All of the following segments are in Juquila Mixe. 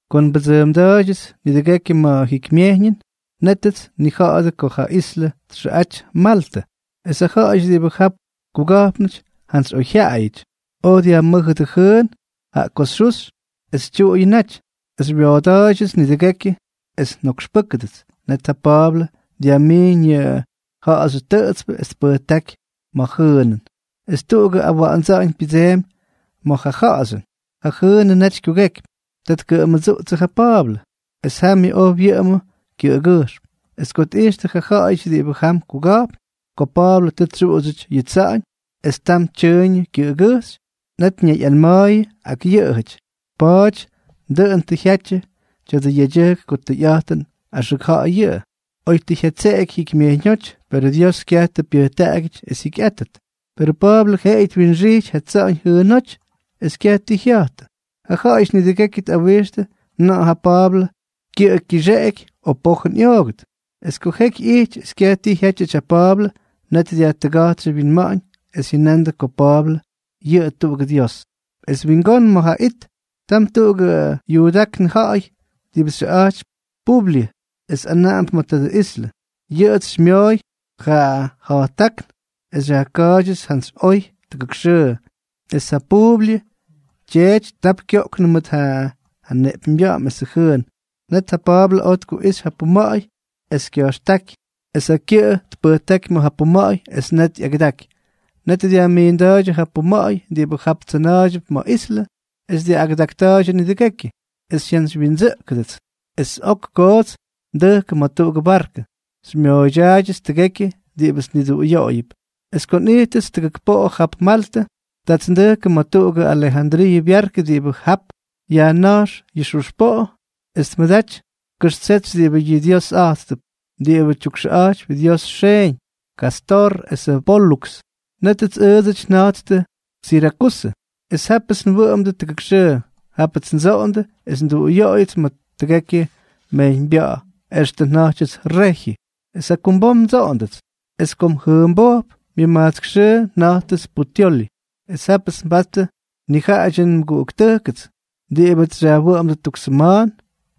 Ko nbʉdsʉʉmda̱a̱ydyʉts nidʉgekyʉ ma̱ jikymyejyñʉn, nétʉts nnija̱ꞌa̱dʉ ko ja islʉ txʉꞌaty Maltʉ. Es ja ja̱ꞌa̱yʉty diꞌibʉ jap kuga̱jpnʉty jantsy oyjyaꞌayʉty, oj dyajmʉ́jʉdʉ jʉʉn, jaꞌa ko xyuxy es tyuꞌuyʉ naty, es xywyooda̱a̱ydyʉts nidʉgekyʉ es njokxpʉ́kʉdʉts. Net ja Pa̱a̱blʉ dyajmiiñ yʉ ja̱ꞌa̱xyʉ tʉꞌʉtspʉ es tpʉjtáky ma̱ jʉʉnʉn. Es tuꞌugʉ awa̱ꞌa̱ndsa̱ꞌa̱ñ pyʉdseemy ma̱ ja ja̱ꞌa̱xyʉn, ja jʉʉnʉ naty kyugekypy, ta tkʉmʉdsuꞌtsʉ ja Pa̱a̱blʉ, es jamyʉ oj wyʉꞌʉmʉ kyʉꞌʉgʉjxm. Es ko tꞌijxtʉ ja ja̱ꞌa̱yʉty diꞌibʉ jam kuga̱jpn ko Pa̱a̱blʉ tʉ tsyuꞌudsyʉty yʉ tsa̱ꞌa̱ñ es tam tyʉʉyñʉ kyʉꞌʉgʉjxy, net ñayꞌanma̱a̱yʉ ak yʉꞌʉjʉty: —Pa̱a̱ty dʉꞌʉn tʉ jyatyʉ tya̱dʉ yedyʉjk ko tʉyꞌa̱jtʉn axʉk ja̱ꞌa̱y yʉꞌʉ. Oy tʉ jyatseꞌeky jikymyejyñóty, perʉ Dios kyaj tʉ pyʉjtaꞌagyʉty es jyikyꞌátʉt. Perʉ Pa̱a̱blʉ jeꞌeyʉ twinxijty ja tsa̱ꞌa̱ñ jʉʉnóty es kyaj ti jya̱jtʉ. Ja ja̱ꞌa̱yʉty nidʉgekyʉ tꞌawixtʉ na̱ꞌa̱ ja Pa̱a̱blʉ kyʉꞌʉ kyixeꞌeky o pojʉn ꞌyoogʉt. Es ko jeky ꞌyijty es kyaj ti jyátyʉty ja Pa̱a̱blʉ, net dyajtʉga̱jtstʉ wyinma̱ꞌa̱ñ es jyʉnandʉ ko Pa̱a̱blʉ yʉꞌʉ tuꞌugʉ dios. Es wingón ma̱ ja it, tam tuꞌugʉ yuudáknʉ ja̱ꞌa̱y diꞌibʉ xyʉꞌa̱jtypy Publyʉ, es anaꞌamp ma̱ tadʉ islʉ. Yʉꞌʉts xymyooy yʉ ja̱jttákn es xyajka̱a̱ydyʉts jantsy oy tʉgʉk xʉʉ. Es ja Publyʉ tyeety tap kyoꞌknʉ mʉt ja neꞌpyñbya̱ꞌa̱m esʉ jʉʉn. Net ja Pa̱a̱blʉ oj tkuꞌixy ja puma̱ꞌa̱y, es kya̱jxtáky es ja kyʉꞌʉ tpʉjtáky ma̱ ja puma̱ꞌa̱y. Es net ꞌyagʉdaky. Net dyajmiinda̱a̱ydyʉ yʉ pyuma̱ꞌa̱y diꞌibʉ jap tsʉna̱a̱ydyʉp ma̱ islʉ, es ꞌyagʉdakta̱a̱ydyʉ nidʉgekyʉ. Es xyjantsywyindsʉꞌkʉdʉts, es ok kots ndʉjkʉ ma̱ jatuꞌugʉ barkʉ, xymyooydyaayʉts tʉgekyʉ diꞌibʉts nniduꞌuyoꞌoyʉp. Es ko nꞌijttʉts tʉgʉk poꞌo jap Maltʉ, taats ndʉjkʉ ma̱ tuꞌugʉ Alejandriiʉ byarkʉ diꞌibʉ jap yajna̱jx yʉ xuxpoꞌo es tmʉdaty kʉxtsetsy diꞌibʉ yʉꞌʉ dyiosꞌa̱jttʉp, diꞌibʉ tyukxʉꞌa̱jtypy dios xeeñ, Kástor esʉ Póluks. Nétʉts ʉʉdsʉty nja̱jttʉ Sirakusʉ. Es jápʉts nwʉꞌʉmʉdʉ tʉgʉk xʉʉ. Jápʉts ndsoꞌondʉ es nduꞌuyoꞌoyʉts ma̱ tʉgekyʉ mejyñbya̱ꞌa̱ extʉ nja̱jtyʉts Rejyʉ. Es jakumbom ndsoꞌondʉts, es kom jʉmbojp, myʉmajtsk xʉʉ nja̱jttʉts Puteoli. Es jápʉts nbattʉ nijaꞌadyʉ nmʉguꞌuktʉjkʉts diꞌibʉts xyajwʉꞌʉmdʉ tuk sʉma̱a̱n,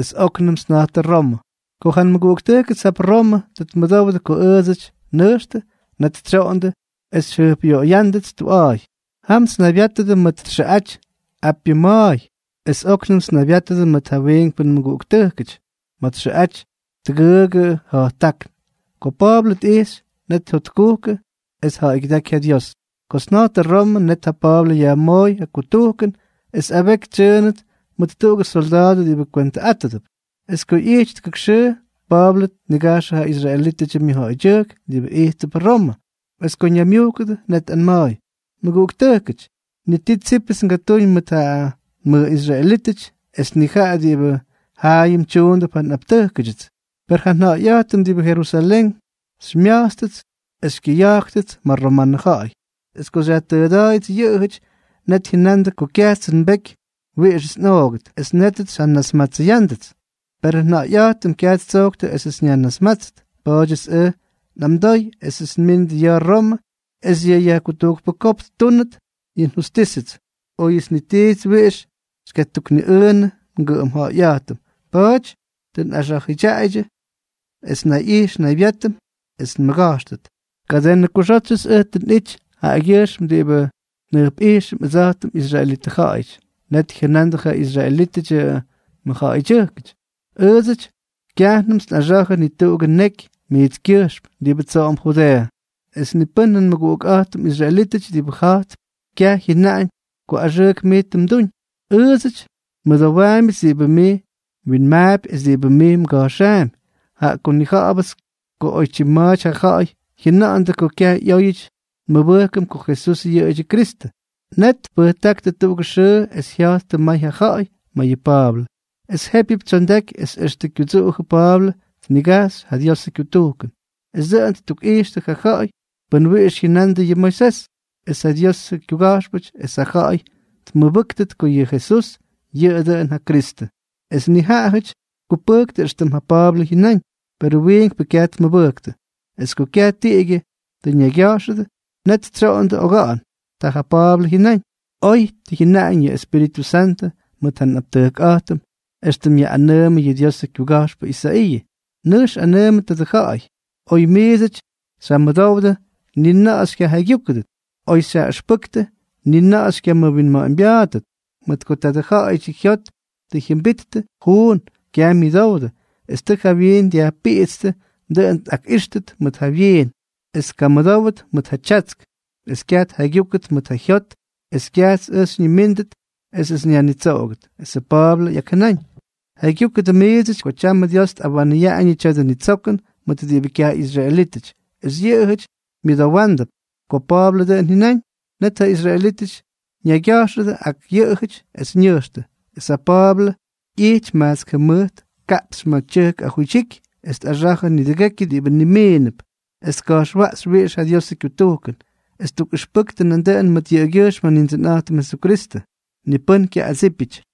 es óknʉmts nja̱ꞌttʉ Romʉ. Ko ja nmʉguꞌuktʉjkʉts jap Romʉ tʉ tmʉdowdʉ ko ʉʉdsʉty nnʉjxtʉ, net tsyoꞌondʉ es xyjʉjpꞌyoꞌoya̱ꞌa̱ndʉts tuꞌa̱a̱y. Jamts nnaybyátʉdʉ ma̱ txʉꞌaty Apyʉ Ma̱a̱y. Es óknʉmts nnaybyátʉdʉ mʉt ja wiinkpʉ nmʉguꞌuktʉjkʉty ma̱ txʉꞌaty Tʉgʉʉgʉ Ja̱jttákn. Ko Pa̱a̱blʉ tꞌijxy, net jyotkujkʉ es tja̱ꞌa̱ygyʉdáky ja Dios. Kots nja̱ꞌttʉ Romʉ, net ja Pa̱a̱blʉ yajmooy yʉ kutujkʉn es abeky tsyʉʉnʉt mʉt tuꞌugʉ solda̱a̱dʉ diꞌibʉ kwentʉꞌátʉdʉp. Es ko ꞌyijty tʉgʉk xʉʉ, Pa̱a̱blʉ tnigajxʉ ja israelítʉdyʉ myʉjja̱ꞌa̱ydyʉjk diꞌibʉ ijttʉp Romʉ. Es ko ñaymyujkʉdʉ, net tꞌanma̱a̱y: —Mʉguꞌuktʉjkʉty, ni ti tsípʉts ngatúñ mʉt ja nmʉꞌisraelítʉty es ni jaꞌa diꞌibʉ jaayʉm tyuundʉp ja nꞌaptʉjkʉdyʉts. Per ja nja̱ꞌa̱yꞌa̱jtʉm diꞌibʉ Jerusalén xymya̱jtstʉts es xykyʉyajkyʉts ma̱ romanʉ ja̱ꞌa̱y. Es ko xyajtʉʉda̱a̱yʉts yʉꞌʉjʉty, net jyʉnandʉ ko kyajtsʉ nbeky wiꞌixʉts nꞌoogʉt. Es nétʉts xyjanasmatsʉyándʉts. Perʉ nja̱ꞌa̱yꞌa̱jtʉm kyaj ttsojktʉ esʉts nyajnasmátsʉt. Pa̱a̱dyʉts ʉj nꞌamdooy esʉts nmínʉt ya̱ Romʉ es yʉ yajkutujkpʉ kopk ttúnʉt yʉ njustísʉts, óyʉts ni tits wiꞌix ngatukniꞌʉʉnʉ ngʉꞌʉm ja̱ꞌa̱yꞌa̱jtʉm. Pa̱a̱ty tʉ nyaxʉdyaꞌaydyʉ es nnayꞌijx nnaybyátʉm es nmʉga̱jxʉt. Kadenʉ kʉꞌʉxótsyʉts ʉj nꞌity jaꞌagyʉjxm diꞌibʉ njʉjpꞌijxʉm, ʉdsa̱jtʉm israelitʉ ja̱ꞌa̱yʉty. Net jyʉnandʉ ja israelítʉdyʉ mʉjja̱ꞌa̱ydyʉjk: —Ʉʉdsʉty kyajnʉmts nꞌaxa̱jʉ ni tuꞌugʉ neky mijtskyʉjxm diꞌibʉ tsoꞌomp Judeeʉ, es ni pʉ́n nmʉguꞌukꞌa̱jtʉm israelítʉty diꞌibʉ ja̱jtp kyaj jyʉnaꞌañ ko axʉʉk mij tʉ mduñ. Ʉʉdsʉty nmʉdowaambyʉts diꞌibʉ mij mwinmaapy es diꞌibʉ mij mga̱jxaampy, jaꞌa ko nnija̱ꞌa̱bʉts ko oytyim ma̱a̱ty ja ja̱ꞌa̱y jyʉna̱ꞌa̱ndʉ ko kyaj ꞌyóyʉty nmʉbʉjkʉm ko Jesús yʉꞌʉ Kyrístʉty. Net tpʉjtáktʉ tuꞌugʉ xʉʉ es jya̱jttʉ may ja ja̱ꞌa̱y ma̱ yʉ Pa̱a̱blʉ. Es jépyʉp tsyondaky es extʉ kyudsuꞌujʉ Pa̱a̱blʉ tnigajxy ja Diosʉ kyutujkʉn, es dʉꞌʉn ttukꞌijxtʉ ja ja̱ꞌa̱y pʉn wiꞌix jyʉnandʉ yʉ Moisés es ja Dios kyuga̱jxpʉty es ja ja̱ꞌa̱y ttukmʉbʉ́ktʉt ko yʉ Jesús yʉꞌʉ dʉꞌʉn ja Kristʉ. Es nijaꞌajʉty tkupʉjktʉ éxtʉm ja Pa̱a̱blʉ jyʉnáñ, per yʉ wiinkpʉ kyaj tmʉbʉjktʉ. Es ko kyaj tiꞌigyʉ tʉ ñaygya̱jxʉdʉ, net tsyoꞌonnʉdʉ oga̱ꞌa̱n, tʉ ja Pa̱a̱blʉ jyʉnaꞌañ: —Oy tʉ jyʉnaꞌañ yʉ Espíritʉ Santʉ mʉt ja nꞌaptʉjkꞌa̱jtʉm éxtʉm yaꞌꞌanʉʉmʉ yʉ Diosʉ kyuga̱jxpʉ Isaiiʉ: Nʉjx anʉʉmʉ tadʉ ja̱ꞌa̱y: Oy miidsʉty xyjamʉdowdʉ, ni na̱ꞌa̱ xykyajaygyúkʉdʉt; oy xyjaꞌijxpʉdʉ, ni na̱ꞌa̱ xykyamʉwinma̱ꞌa̱ñbya̱a̱ttʉt. Mʉt ko tadʉ ja̱ꞌa̱yʉdyʉ jyot tʉ jyʉmbittʉ juun, kyaj myʉdowdʉ es tʉ ja wyiin dyajpiꞌitstʉ, dʉꞌʉn tkaꞌíxtʉt mʉt ja wyiin es tkamʉdówʉt mʉt ja tyatsk, es kyaj tjaygyúkʉdʉt mʉt ja jyot, es kyajts ʉj xyñimíndʉt esʉts nyajnitsoꞌogʉt. Esʉ Pa̱a̱blʉ ꞌyakjʉnáñ: —Jaygyúkʉdʉ miidsʉty ko tyam Dios tꞌawanʉyaꞌañʉ tya̱dʉ nitsokʉn mʉt diꞌibʉ kyaj ꞌyisraelítʉty, es yʉꞌʉjʉty myʉdowándʉp. Ko Pa̱a̱blʉ dʉꞌʉn jyʉnáñ, net ja israelítʉty ñaygya̱jxʉdʉ ak yʉꞌʉjʉty es ñʉjxtʉ. Es ja Pa̱a̱blʉ ꞌyijty majtsk jʉmʉjt kaꞌpxy ma̱ tyʉjk ajuydyiky es tꞌaxa̱jʉ nidʉgekyʉ diꞌibʉ nimiinʉp, es tka̱jxwaꞌxy wiꞌix ja Diosʉ kyutujkʉn. Es ttukꞌʉxpʉktʉ nandʉꞌʉn mʉt yʉꞌʉgyʉjxm ja Nindsʉnꞌa̱jtʉm Jesukristʉ. Ni pʉ́n kyaꞌꞌadsípyʉty.